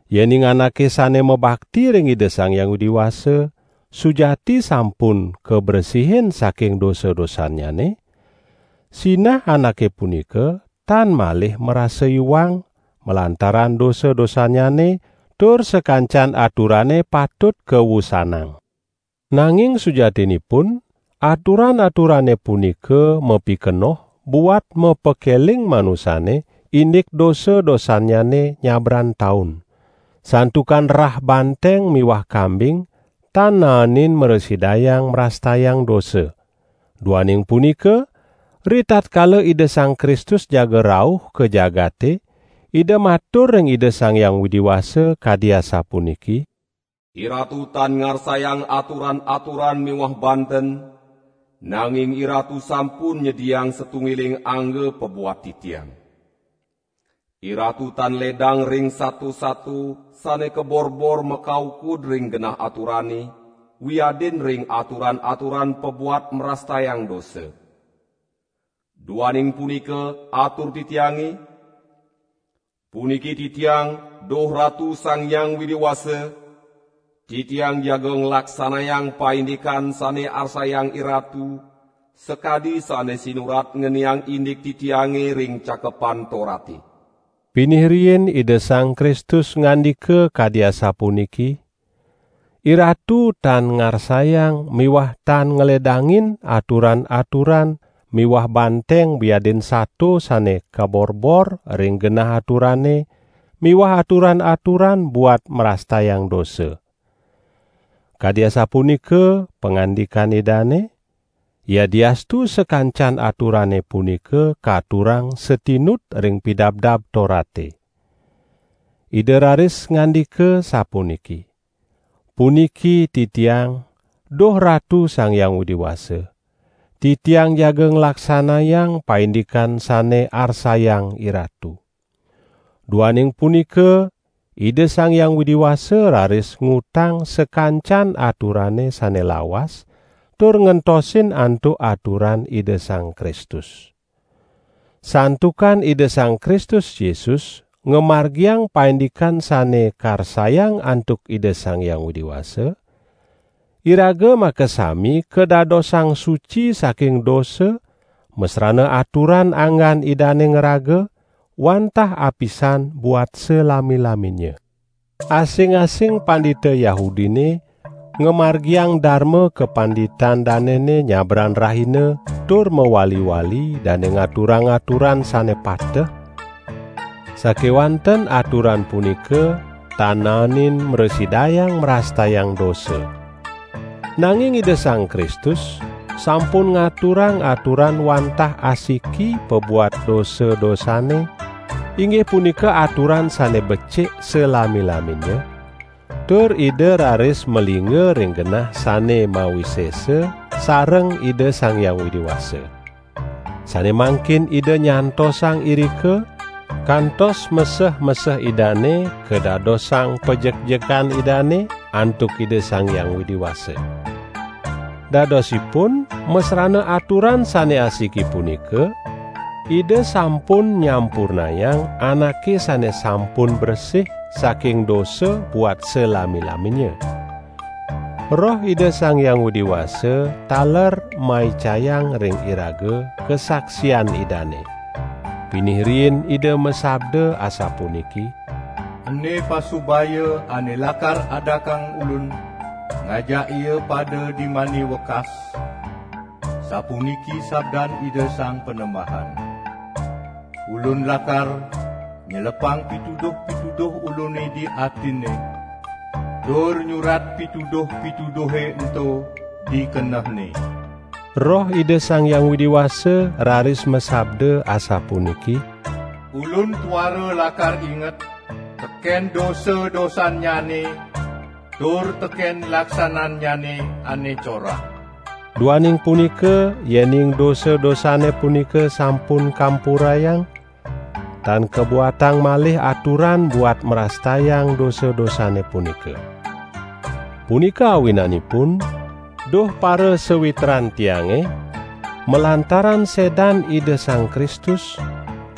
Yening anake sane mabakti ring Ida Sang Hyang Widi Wasa sujati sampun kabresihin saking dosa-dosannyane, sinah anake punika tan malih marasa iwang malantaran dosa-dosannyane, tur sakancan aturane patut kawusanang. Nanging sujatinipun aturan-aturane punika mapikenoh buat mapakeling manusane indik dosa-dosannyane nyabran taun. Santukan rah banteng miwah kambing tan naenin mrasidayang mrastayang dosa. Duaning punika, ritatkala Ida Sang Kristus jaga rauh ka jagate Ida matur ring Ida Sang Hyang Widi Wasa kadi asapuniki: "IRatu tan ngarsayang aturan-aturan miwah banten, nanging IRatu sampun nyediayang satunggiling angga pabuat Titiang. IRatu tan ledang ring sato-sato sane kaborbor makaukud ring genah aturane, wiadin ring aturan-aturan pabuat mrastayang dosa. Duaning punika atur Titiange: 'Puniki Titiang, duh Ratu Sang Hyang Widi Wasa, Titiang jaga nglaksanayang paindikan sane arsayang IRatu, sakadi sane sinurat ngeniang indik Titiange ring Cakepan Torate.' " Pinih riin Ida Sang Kristus ngandika kadi asapuniki: "IRatu tan ngarsayang miwah tan ngledangin aturan-aturan miwah banteng wiadin sato sane kaborbor ring genah aturane miwah aturan-aturan buat mrastayang dosa." Kadi asapunika pangandikan Idane, yadiastu sakancan aturane punika katurang satinut ring Pidabdab Torate. Ida raris ngandika sapuniki: "Puniki Titiang, duh Ratu Sang Hyang Widi Wasa. Titiang jaga nglaksanayang paindikan sane arsayang IRatu." Duaning punika Ida Sang Hyang Widi Wasa raris ngutang sakancan aturane sane lawas tur ngentosin antuk aturan Ida Sang Kristus. Santukan Ida Sang Kristus Yesus ngamargiang paindikan sane karsayang antuk Ida Sang Hyang Widi Wasa, iraga makasami kadadosang suci saking dosa masrana aturan anggan Idane ngraga, wantah apisan buat salami-laminnya. Asing-asing pandita Yahudine ngamargiang darma kapanditan danene nyabran rahina tur mawali-wali dane ngaturang aturan sane pateh, sakewanten aturan punika tan naenin mrasidayang mrastayang dosa. Nanging Ida Sang Kristus sampun ngaturang aturan wantah asiki pabuat dosa-dosane, inggih punika aturan sane becik salami-laminnya, tur Ida raris malingga ring genah sane mawisesa sareng Ida Sang Hyang Widi Wasa. Sane mangkin Ida nyantosang irika, kantos meseh-meseh Idane kadadosang pajekjekan Idane antuk Ida Sang Hyang Widi Wasa. Dadosipun masrana aturan sane asiki punika, Ida sampun nyampurnayang anake sane sampun bresih saking dosa buat salami-laminnya. Roh Ida Sang Hyang Widi Wasa taler maicayang ring iraga kasaksian Idane. Pinih riin Ida masabda asapuniki: "Ene pasubaya ane lakar adakang Ulun ngajak ia pada dimani wekas, sapuniki sabdan Ida Sang Panembahan: Ulun lakar nyelepang pituduh-pituduh Ulune di atinne, tur nyurat pituduh-pituduhe ento di kenehne." Roh Ida Sang Hyang Widi Wasa raris masabda asapuniki: "Ulun tuara lakar inget teken dosa-dosannyane tur teken laksanannyane ane corah." Duaning punika yening dosa-dosane punika sampun kampurayang, tan kabuatang malih aturan buat mrastayang dosa-dosane punika. Punika awinanipun, duh parasawitran tiange, malantaran sedan Ida Sang Kristus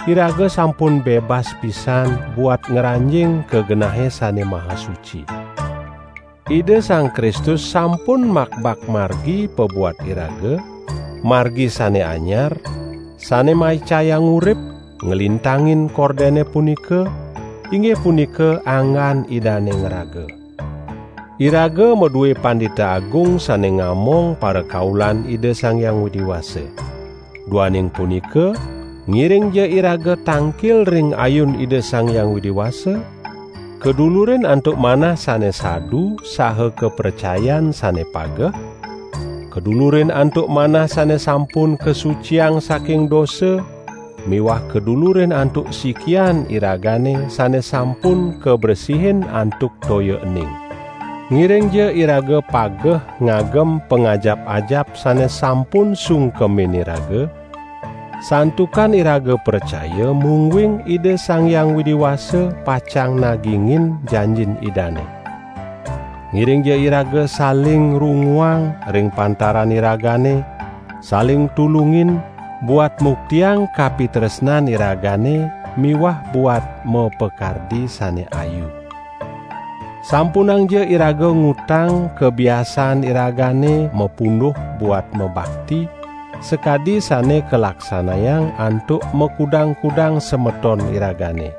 iraga sampun bebas pisan buat ngranjing ka Genahe Sane Maha Suci. Ida Sang Kristus sampun makbak margi pabuat iraga, margi sane anyar, sane maicayang urip, nglintangin kordene punika, inggih punika anggan Idane ngraga. Iraga madue Pandita Agung sane ngamong parakaulan Ida Sang Hyang Widi Wasa. Duaning punika, ngiringja iraga tangkil ring ayun Ida Sang Hyang Widi Wasa, kadulurin antuk manah sane sadu saha kapracayan sane pageh, kadulurin antuk manah sane sampun kasuciang saking dosa miwah kadulurin antuk sikian iragane sane sampun kabresihin antuk toya ening. Ngiringja iraga pageh ngagem pangajap-ajap sane sampun sungkemin iraga, santukan iraga pracaya, mungguing Ida Sang Hyang Widi Wasa pacang nagingin janjin Idane. Ngiringja iraga saling runguang ring pantaran iragane, saling tulungin, buat muktiang kapitresnan iragane miwah buat mapakardi sane ayu. Sampunangja iraga ngutang kabiasaan iragane mapunduh buat mabakti, sakadi sane kalaksanayang antuk makudang-kudang semeton iragane.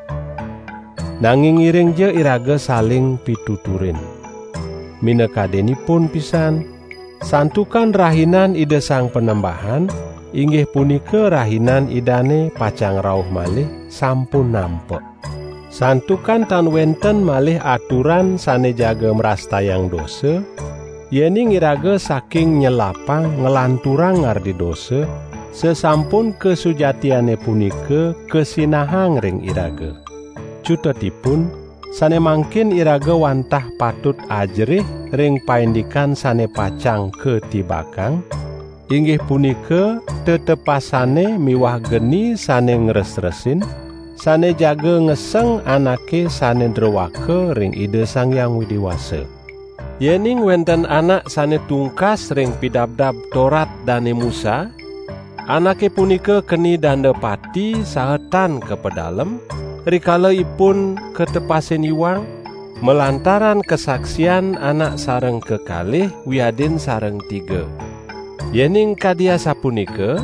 Nanging, ngiringja iraga saling pituturin. Minakadinipun pisan, santukan Rahinan Ida Sang Panembahan inggih punika Rahinan Idane pacang rauh malih, sampun nampek. Santukan tan wenten malih aturan sane jaga mrastayang dosa, yening iraga saking nyelapang nglanturang ngardi dosa, sasampun kasujatiane punika kasinahang ring iraga. Cutetipun, sane mangkin iraga wantah patut ajerih ring paindikan sane pacang katibakang, inggih punika: tetepasane miwah geni sane ngresresin, sane jaga ngeseng anake sane droaka ring Ida Sang Hyang Widi Wasa! Yening wenten anak sane tungkas ring Pidabdab Torat Dane Musa, anake punika keni danda pati saha tan kapedalem, rikala ipun katepasin iwang, malantaran kasaksian anak sareng kekalih wiadin sareng tiga. Yening kadi asapunika,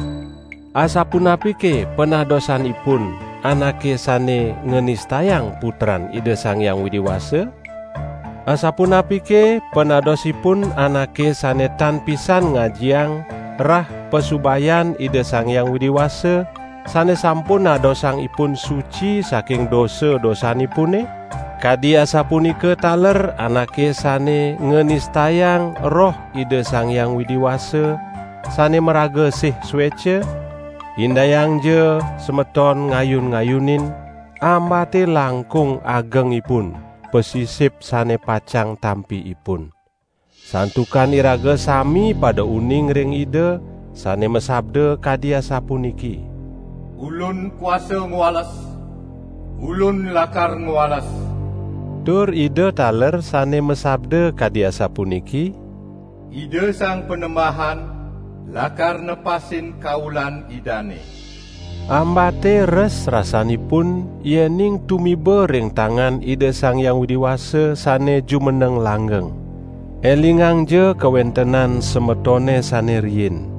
asapunapike panadosanipun anake sane nganistayang Putran Ida Sang Hyang Widi Wasa? Asapunapike panadosipun anake sane tan pisan ngajiang rah pasubayan Ida Sang Hyang Widi Wasa, sane sampun nadosang ipun suci saking dosa-dosanipune? Kadi asapunika taler anake sane nganistayang Roh Ida Sang Hyang Widi Wasa sane maraga sih sueca? Indayangja semeton ngayun-ngayunin, ambate langkung agengipun pasisip sane pacang tampi ipun. Santukan iraga sami pada uning ring Ida, sane masabda kadi asapuniki: "Ulun kuasa ngwales. Ulun lakar ngwales." Tur Ida taler sane masabda kadi asapuniki: "Ida Sang Panembahan lakar nepasin kaulan Idane." Ambate res rasanipun yening tumiba ring tangan Ida Sang Hyang Widi Wasa sane jumeneng langgeng. Elingangja kawentenan semetone sane riin.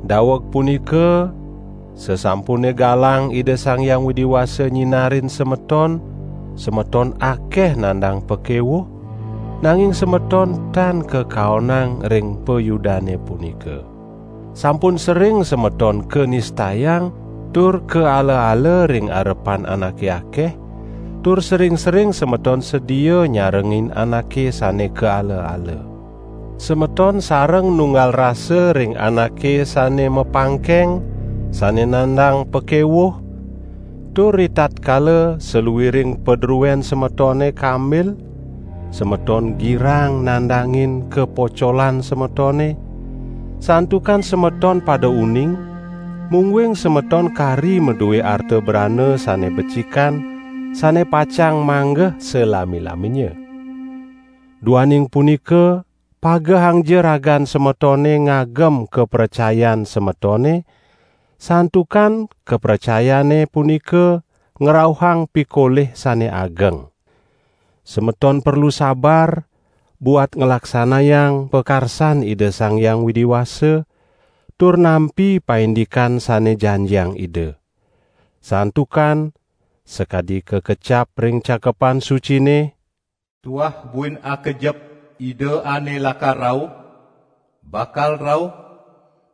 Daweg punika, sasampune galang Ida Sang Hyang Widi Wasa nyinarin semeton, semeton akeh nandang pakewuh, nanging semeton tan kakaonang ring payudane punika. Sampun sering semeton kanistayang tur kaala-ala ring arepan anake akeh, tur sering-sering semeton sedia nyarengin anake sane kaala-ala. Semeton sareng nunggal rasa ring anake sane mapangkeng sane nandang pakewuh, tur ritatkala saluiring padruen semetone kambil, semeton girang nandangin kapocolan semetone, santukan semeton pada uning, mungguing semeton kari madue arta brana sane becikan, sane pacang manggeh salami-laminnya. Duaning punika pagehangja ragan semetone ngagem kapracayan semetone, santukan kapracayane punika ngrauhang pikolih sane ageng. Semeton perlu sabar, buat nglaksanayang pakarsan Ida Sang Hyang Widi Wasa tur nampi paindikan sane janjiang Ida. Santukan, sakadi kakecap ring Cakepan Sucine: "Tuah buin akejep Ida ane lakar rauh, bakal rauh,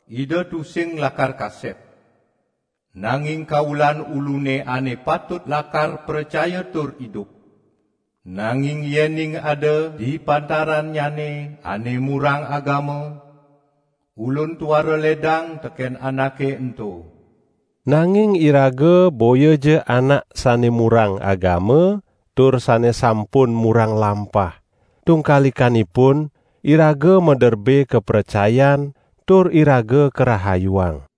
Ida tusing lakar kasep. Nanging kaulan Ulune ane patut lakar pracaya tur idup; nanging yening ada di pantarannyane ane murang agama, Ulun tuara ledang teken anake ento." Nanging iraga boyaja anak sane murang agama tur sane sampun murang lampah. Tungkalikanipun, iraga maderbe kapracayan tur iraga karahayuang.